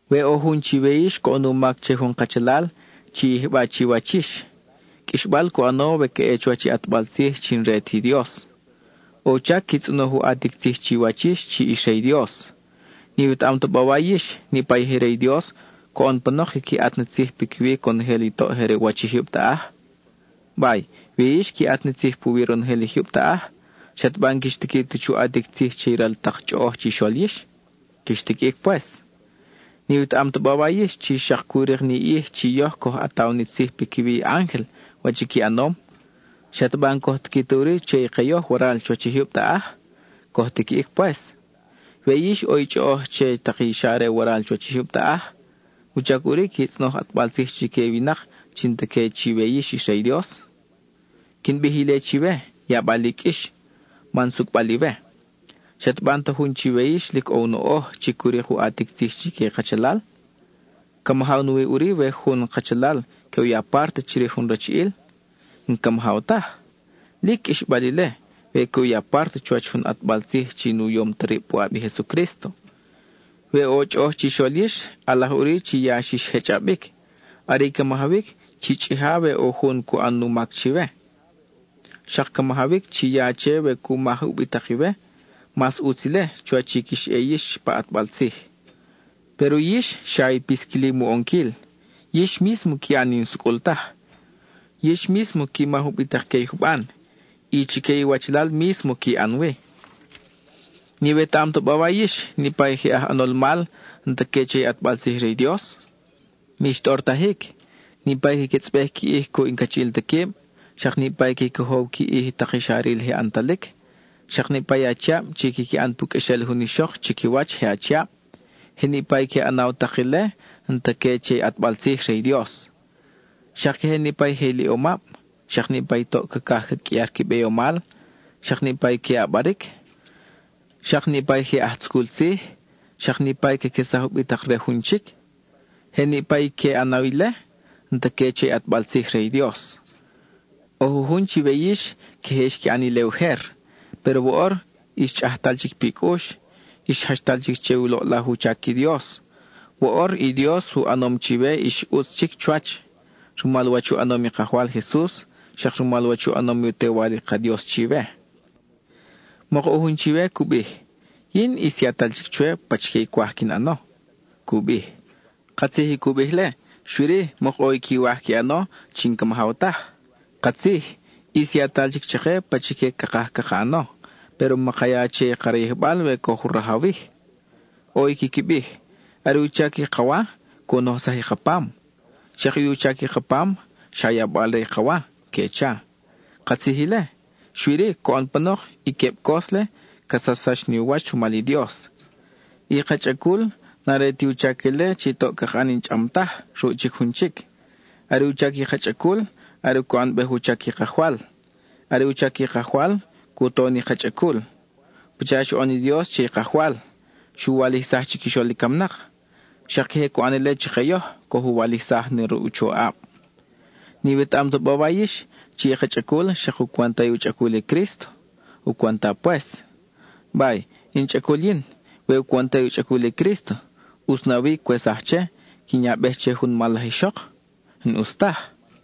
We ʼo jun chiwe yix coʼon u mac che jun kachalal, chi yijba chiwach yix. Qʼuixbal cu ʼano we ca ʼe chuwach i ʼatbal tzij chi n-re ti Dios. ʼO u chac qui tzʼonoj u ʼatic tzij chiwach yix chi ix re i Dios. ¿N-iwetaʼam ta bawa yix, niʼpa i je re i Dios, coʼon panok quiqui ʼat na tzij piquiwi conojel i toʼ je re u wach i jyub taʼaj? Bay, we yix qui ʼat ni tzij puwi ronojel i jyub taʼaj, ¿xataba n-quix tiqui ta chu ʼatic tzij che i ral tak chʼoʼoj chixol yix? Quix tiquiʼic pues. ¿N-iwetaʼam ta bawa yix chi xak cu rik ni ʼij chi yoj coj ʼataw ni tzij piquiwi i ángel, wach qui ʼanom? ¿Xataba n-coj tiqui ta ʼuri che i ke yoj waral chuwach i jyub taʼaj? Coj tiquiʼic pues. We yix ʼo i chʼoʼoj che tak i xa re waral chuwach i jyub taʼaj, ¿wuchac ʼuri qui tzʼonoj ʼatbal tzij chique i winak chi n-ta que chiwe yix ix re i Dios? Quin bij ile chiwe, yabal i qʼuix, man sucʼbal iwe. ¿Xataba n-ta jun chiwe yix lic ʼo u noʼoj, chi cu rik u ʼatic tzij chique i kachalal? ¿Ca majaw nawi ʼuri we jun kachalal que u ya párte chirij jun rachiʼil? N-ca majaw taj. Lic qʼuixbal ile, we que u ya párte chuwach jun ʼatbal tzij chi nu yom ta rib puʼab i Jesucrísto. We ʼo chʼoʼoj chixol yix, ʼalaj ʼuri chi ya xix jechʼabic. Are i ca majawic, chi chʼija we ʼo jun cu ʼan u mac chiwe. Xak ca majawic, chi ya che we cu maj ubitak-iwe; mas ʼutz ile, chuwach i quix ʼe yix pa ʼatbal tzij. Péro yix xa i pisquilim u ʼonquil. Yix mísmo qui ʼan i n-sucʼul taj; yix mísmo qui maj ubitak que i juban, y chique iwachalal mísmo qui ʼan wi. ¿N-iwetaʼam ta bawa yix, niʼpa i je aj ʼanol mal, n-ta que che i ʼatbal tzij re i Dios? Mix tʼortajic, niʼpa i caquetzʼbej qui ʼij cuʼ i n-cachiʼil ta quib, xak niʼpa i que cojow qui ʼij tak i xa ril je ʼantalic, xak niʼpa i achiab chi quiqui ʼan pu qʼuexel jun ixok chiquiwach je achiab, je niʼpa i que ʼanaw tak ile n-ta que che i ʼatbal tzij re i Dios. Xak queje niʼpa i je iliʼomab, xak niʼpa i toʼ cacaj ca qʼuiar qui beyomal, xak niʼpa i que ʼabaric, xak niʼpa i je aj tzucul tzij, xak niʼpa i caquesaj ubitak re jun chic; je niʼpa i que ʼanaw ile, n-ta que che i ʼatbal tzij re i Dios. ʼO jujun chiwe yix queje xqui ʼan ile ujer, péro woʼor ix chʼajtal chic pi cʼux, ix jachtal chic che i loʼlaj u chac i Dios; woʼor i Dios u ʼanom chiwe ix ʼutz chic chuwach, rumal wach u ʼanom i Kajwal Jesus, xak rumal wach u ʼanom i u Tewal i ka Dios chiwe. Mok ʼo jun chiwe cu bij: “Yin ʼis yatal chic chwe pachique cwaj quin ʼano,” cu bij. Katzij i cu bij-le, xui-ri, mok ʼo i quiwaj qui ʼano chi n-ca majaw taj. Katzij, ʼis yatal chic chake pachique cakaj caka ʼano, péro maka ya che i ka rayijbal we coj u rajawij. ʼO i quiqui bij: “Are u chac i ka wa, cu nojsaj i ka pam, xak i u chac i ka pam, xa yabal re i ka wa,” que cha. Katzij ile, xui-ri, coʼon panok, i queb cos-le ca sachsax ni u wach rumal i Dios. I ka chʼacul, n-are ti u chac ile chi toʼ caka ʼan i n-chʼam taj ruʼ chic jun chic. Are u chac i ka chʼacul, are cu ʼanbej u chac i Kajwal; are u chac i Kajwal, cu to ni ka chʼacul. Pacha xu ʼan i Dios che i Kajwal, xu walijsaj chiquixol i camnak, xak queje cu ʼan ile chake yoj, coj u walijsaj na ruʼ u choʼab. ¿N-iwetaʼam ta bawa yix, chi i ka chʼacul xak u cwenta i u chʼacul i Crísto? U cwenta pues. Bay, in chʼacul yin, we u cwenta i u chʼacul i Crísto, ¿ʼutz na wi cwesaj che, quin yabej che jun mal laj ixok? N-ʼus taj.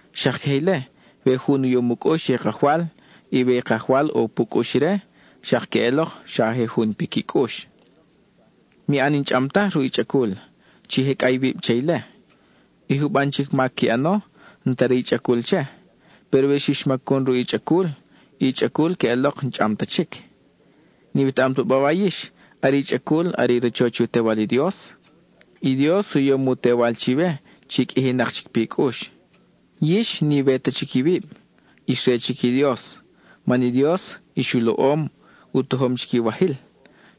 Xak queje ile, we jun u yom u cʼux che i Kajwal, y we i Kajwal ʼo pu cʼux ire, xak queʼelok xa je jun piqui cʼux. Mi ʼan i n-chʼam taj ruʼ i chʼacul; chi jecʼa iwib che ile. I juban chic mac qui ʼano, n-ta re i chʼacul che. Péro we xix macun ruʼ i chʼacul, i chʼacul queʼelok n-chʼam ta chic. ¿N-iwetaʼam taba yix, are i chʼacul are i rachoch i u Tewal i Dios? I Dios u yom u Tewal chiwe, chi qʼuijinak chic pi cʼux. Yix n-iwe ta chic iwib; ix re chic i Dios, man i Dios ix u loʼom, u tojom chic iwajil.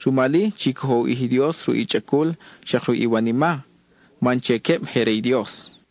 Rumal-i, chi cojo u ʼij i Dios ruʼ i chʼacul xak ruʼ iwanima, man che queb je re i Dios.